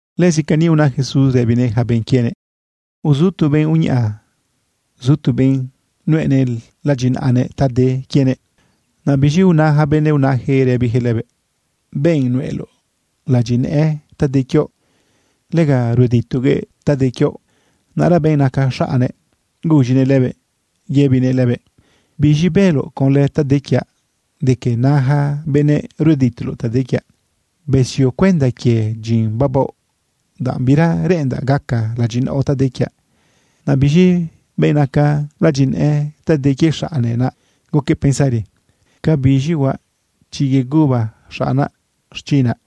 Lëzi cani una Jesús rëbinëꞌ yaca benꞌ quienëꞌ: ―Uzu tu benꞌ uñaꞌa zu tu benꞌ nuꞌenëꞌ ladyinaꞌanëꞌ ta de quienëꞌ. Naꞌ biz̃i una yaca benëꞌ unayaquëꞌ rëbiyaquëꞌ lëbëꞌ: “Benꞌ nuꞌeloꞌ ladyinëꞌë ta de quioꞌ, lega rueditoguëꞌ ta de quioꞌ.” Naꞌra benꞌ naca xaꞌnnëꞌ guz̃inëꞌ lëbëꞌ yëbinëꞌ lëbëꞌ: “¿Biz̃i bëloꞌ conlë ta de quiaꞌ de que na yaca benëꞌ rueditoloꞌ ta de quiaꞌ? Besio cuenda quie dyin babaoꞌ, danꞌ bira reꞌendaꞌ gaca ladyinaoꞌ ta de quiaꞌ.” Naꞌ biz̃i benꞌ naca ladyinëꞌë ta de quie xaꞌne, naꞌ guquëꞌ pensari: “¿Ca biz̃i huaꞌ chi yeguba xaꞌnaꞌ xchinaꞌ?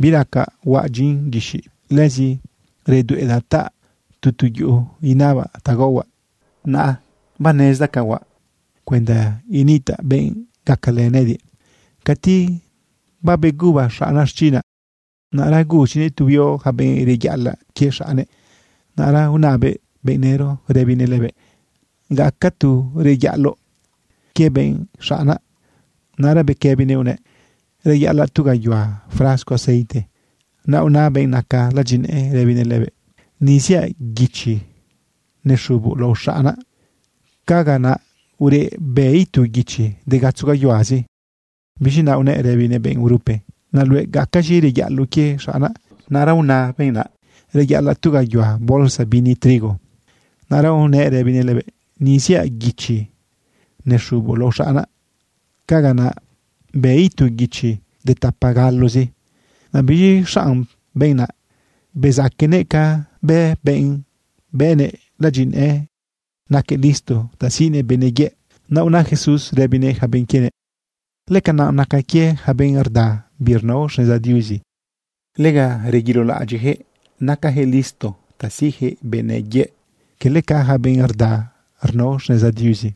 Biracaꞌ huaꞌ dyin guixiꞌ. Lëzi redueꞌdaꞌ taꞌa tu tu yuꞌu inabaꞌ ta gaohuaꞌ. Naꞌa banezdaꞌ ca huaꞌ cuenda initaꞌ benꞌ gacalë nëꞌëdiꞌ cati babeguba xaꞌnaꞌ xchinaꞌ.” Naꞌra guz̃inëꞌ tu huio yaca benꞌ reyaꞌalaꞌ quie xaꞌnnëꞌ. Naꞌra unabëꞌ benꞌ nëro rëbinëꞌ lëbëꞌ: “¿Gaca tu reyaꞌaloꞌ quie benꞌ xaꞌnaꞌ?” Naꞌra bequëbinëꞌ unëꞌ: “Reyaꞌalaꞌ tu gayuhua frasco aceite.” Naꞌ una benꞌ naca ladyinëꞌë rëbinëꞌ lëbëꞌ: “Ni ziaꞌ guichi nexuboꞌ lao xaꞌnaꞌ. Caga naꞌa ureꞌ bë itu guichi de gatzo gayuhuazi.” Biz̃i naꞌ unëꞌ rëbinëꞌ benꞌ urupe: “Naꞌ luëꞌ, ¿gacaz̃i reyaꞌaloꞌ quie xaꞌnaꞌ?” Naꞌra una benꞌ naꞌ: “Reyaꞌalaꞌ tu gayuhua bolsa bini trigo.” Naꞌra unëꞌ rëbinëꞌ lëbëꞌ: “Ni ziaꞌ guichi nexuboꞌ lao xaꞌnaꞌ. Caga naꞌa bë itu guichi de tapa galozi.” Naꞌ biz̃i xanꞌ benꞌ naꞌ, bezaquenëꞌ ca bë benꞌ bëꞌnëꞌ ladyinëꞌë, naquëꞌ listo ta siꞌnëꞌ benëꞌ yëꞌ. Naꞌ una Jesús rëbinëꞌ yaca benꞌ quienëꞌ: ―Lëcanaꞌ nacan quie yaca benꞌ rda birnao xneza Diuzi, lega rzebilaꞌadyiꞌyaquëꞌ nacayaquëꞌ listo ta siꞌyaquëꞌ benëꞌ yëꞌ, cala ca yaca benꞌ rda rnao xneza Diuzi.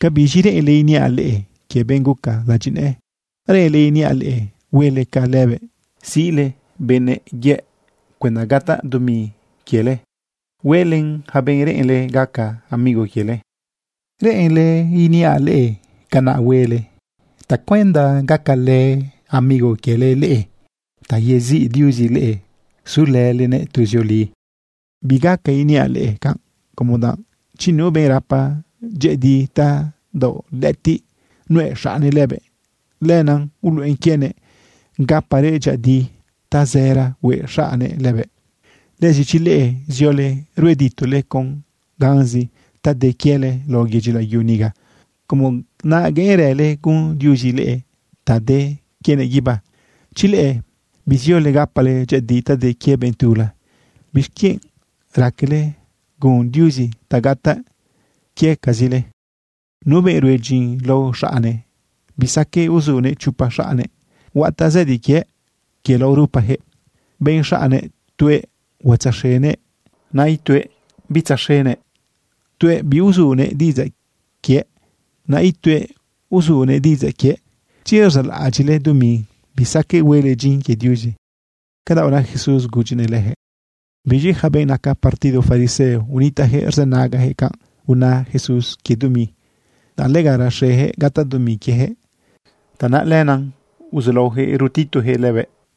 ’¿Cabiz̃i reꞌenle iniaꞌ leꞌe quie benꞌ guca ladyinëꞌë? ¿Reꞌenle iniaꞌ leꞌe huele ca lëbëꞌ siꞌle benꞌ yëꞌ cuenda gataꞌ dumi quiele hueꞌlen yaca benꞌ reꞌenle gaca amigo quiele? ¿Reꞌenle iniaꞌ leꞌe canaꞌ huele tacuenda gacalë amigo quiele leꞌe ta yeziꞌ Diuzi leꞌe sulëlenëꞌ tuzioli? ’Bigaca iniaꞌ leꞌe canꞌ, como danꞌ chi nu benꞌ rapa dyëꞌëdi tadaoꞌ lëꞌëtiꞌ nuꞌe xaꞌnnëꞌ lëbëꞌ, lenaꞌ uluꞌena quienëꞌ gaparëꞌ dyëꞌëdi tazëra hueꞌ xaꞌnnëꞌ lëbëꞌ. Lëzi chi leꞌe ziole rueditole con ganzi ta de quiele lao yedyi layu niga, ¿cómo naꞌa gueꞌenrële gun Diuzi leꞌe ta de quienëꞌ guibá? ’Chi leꞌe biziole gapale dyëꞌëdi ta de quie benꞌ tula, ¿bixquienꞌ raquele gun Diuzi ta gataꞌ quiecazile? Nu benꞌ rue dyin lao xaꞌne, bisaqueꞌ uzunëꞌ chopa xaꞌnnëꞌ. Huataꞌ zëdi quiëꞌ quie lao rupa yaca benꞌ xaꞌnnëꞌ. Tuëꞌ huatzaxenëꞌ, naꞌ ituëꞌ bitzaxenëꞌ. Tuëꞌ biuzunëꞌ diꞌidzaꞌ quiëꞌ, naꞌ ituëꞌ uzunëꞌ diꞌidzaꞌ quiëꞌ. Chi rzaꞌlaꞌadyiꞌle dumi, bisaqueꞌ huele dyin quie Diuzi. ―Canaꞌ una Jesús gudyinëꞌ leyaquëꞌ. Biz̃i yaca benꞌ naca partido fariseo, unitaꞌyaquëꞌ rzënagayaquëꞌ canꞌ una Jesús quie dumi. Danꞌ lega rexeyaquëꞌ gataꞌ dumi quieyaquëꞌ, tanaꞌ lenaꞌ uzulaoyaquëꞌ rtituyaquëꞌ lëbëꞌ.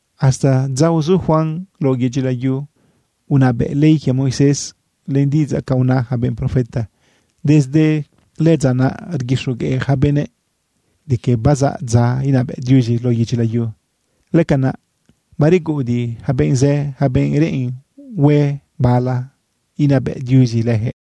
―Hasta dza uzu Juan lao yedyi layu unabëꞌ ley quie Moisés len diꞌidzaꞌ ca una yaca benꞌ profeta. Desde lëdza naꞌ rguixogueꞌ yaca benëꞌ de que bazaꞌ dza inabëꞌ Diuzi lao yedyi layu. Lëcanaꞌ bareguꞌudiꞌ yaca benꞌ zë, yaca benꞌ reꞌen hue bala inabëꞌ Diuzi leyaquëꞌ.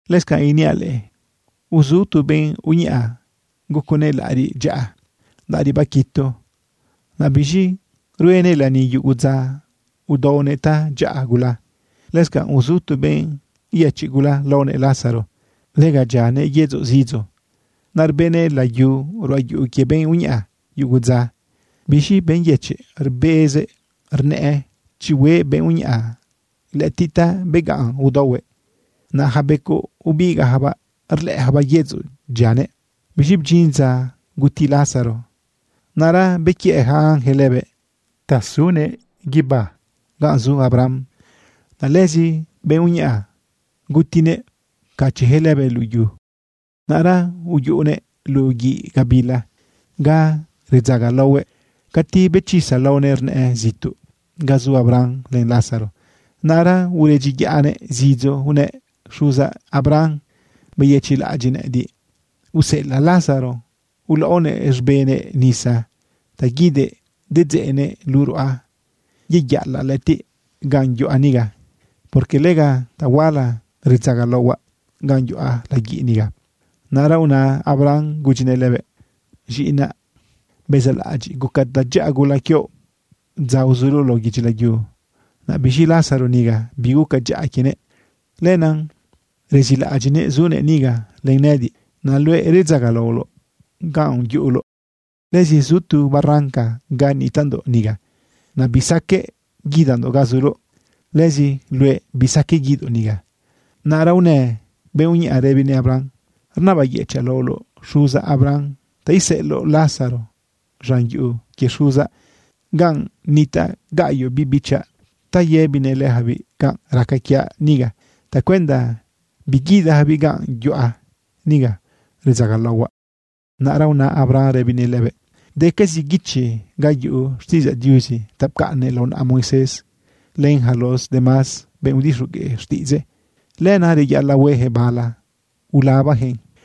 ―Lëscanꞌ iniaꞌ leꞌe, uzu tu benꞌ uñaꞌa guconëꞌ laꞌariꞌ dyaꞌa, laꞌariꞌ baquitu. Naꞌ biz̃i ruenëꞌ lani yugu dza, udaonëꞌ tadyaꞌa gula. Lëscanꞌ uzu tu benꞌ yëchiꞌ gula laonëꞌ Lázaro. Lega dyianëꞌ yedzoꞌ zidzo. Naꞌ rbeꞌnëꞌ layu ruꞌa yuꞌu quie benꞌ uñaꞌa yugu dza. Biz̃i benꞌ yëchiꞌ rbezëꞌ rnëꞌë chi hueꞌ benꞌ uñaꞌa lëꞌëtiꞌ ta beganꞌ udaohuëꞌ. Naꞌ yaca becoꞌ ubigaꞌyacabaꞌ rlëꞌëyacabaꞌ yedzoꞌ dyianëꞌ. Biz̃i bdyin dza guti Lázaro. Naꞌra bequiëꞌ yaca ángel lëbëꞌ ta sunëꞌ guibá ganꞌ zu Abraham. Naꞌ lëzi benꞌ uñaꞌa gutinëꞌ pcachiꞌyaquëꞌ lëbëꞌ luꞌu yu. Naꞌra uyuꞌunëꞌ luꞌu guiꞌ gabila ga redzagalaohuëꞌ. Cati bechisa laonëꞌ rnëꞌë zituꞌ ga zu Abraham len Lázaro. Naꞌra uredyiyaꞌnëꞌ zidzo unëꞌ: “Xuzaꞌ Abraham, beyëchiꞌlaꞌadyiꞌ nëꞌëdiꞌ, useꞌelaꞌ Lázaro ulaꞌonëꞌ z̃benëꞌ nisa ta guidëꞌ dedzeꞌnëꞌn luꞌu ruꞌa yeyaꞌalaꞌ lëꞌëtiꞌ ganꞌ yuꞌa niga, porque lega tahuala redzagalaohuaꞌ ganꞌ yuꞌa laguiꞌ niga.” Naꞌra una Abraham gudyinëꞌ lëbëꞌ: “Z̃iꞌinaꞌ, bezaꞌlaꞌadyiꞌ guca dyaꞌa gula quioꞌ dza uzuloꞌ lao yedyi layu. Naꞌ biz̃i Lázaro niga, biguca dyaꞌa quienëꞌ. Lenaꞌ rezilaꞌadyiꞌnëꞌ zunëꞌ niga len nëꞌëdiꞌ. Naꞌ luëꞌ redzagalaoloꞌ ganꞌ yuꞌuloꞌ. Lëzi zu tu barranca ga nitaꞌndoꞌ niga. Naꞌ bisaqueꞌ guidandoꞌ ga zuloꞌ. Lëzi luëꞌ bisaqueꞌ guidoꞌ niga.” Naꞌra unë benꞌ uñaꞌa rëbinëꞌ Abraham: “Rnabayëchaꞌ laoloꞌ, xuzaꞌ Abraham, ta iseꞌeloꞌ Lázaro z̃an yuꞌu quie xuzaꞌ ganꞌ nitaꞌ gaꞌyoꞌ biꞌ bichaꞌ ta yëbinëꞌ leyacabiꞌ canꞌ raca quiaꞌ niga tacuenda biguidayacabiꞌ ganꞌ yuꞌa niga redzagalohuaꞌ.” Naꞌra una Abraham rëbinëꞌ lëbëꞌ: “Decazi guichi ga yuꞌu xtiꞌidzaꞌ Diuzi ta pcaꞌnnëꞌ lao naꞌa Moisés len yaca los demás benꞌ udixogueꞌ xtiꞌidzëꞌ. Lenaꞌ reyaꞌalaꞌ hueyaquëꞌ bala ulabayaquëꞌn.”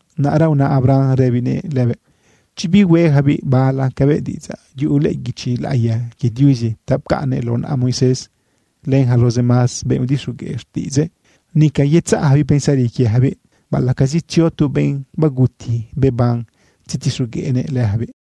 Naꞌra una Abraham rëbinëꞌ lëbëꞌ: “Chi bihueyacabiꞌ bala cabëꞌ diꞌidzaꞌ yuꞌu lëꞌë guichi laꞌiya quie Diuzi ta pcaꞌnnëꞌ lao naꞌa Moisés, len yaca los demás benꞌ udixogueꞌ xtiꞌidzëꞌ, nica yetzaꞌyacabiꞌ pensari quieyacabiꞌ baꞌalaꞌcazi tzio tu benꞌ baguti beban tzetixogueꞌnëꞌ leyacabiꞌ.”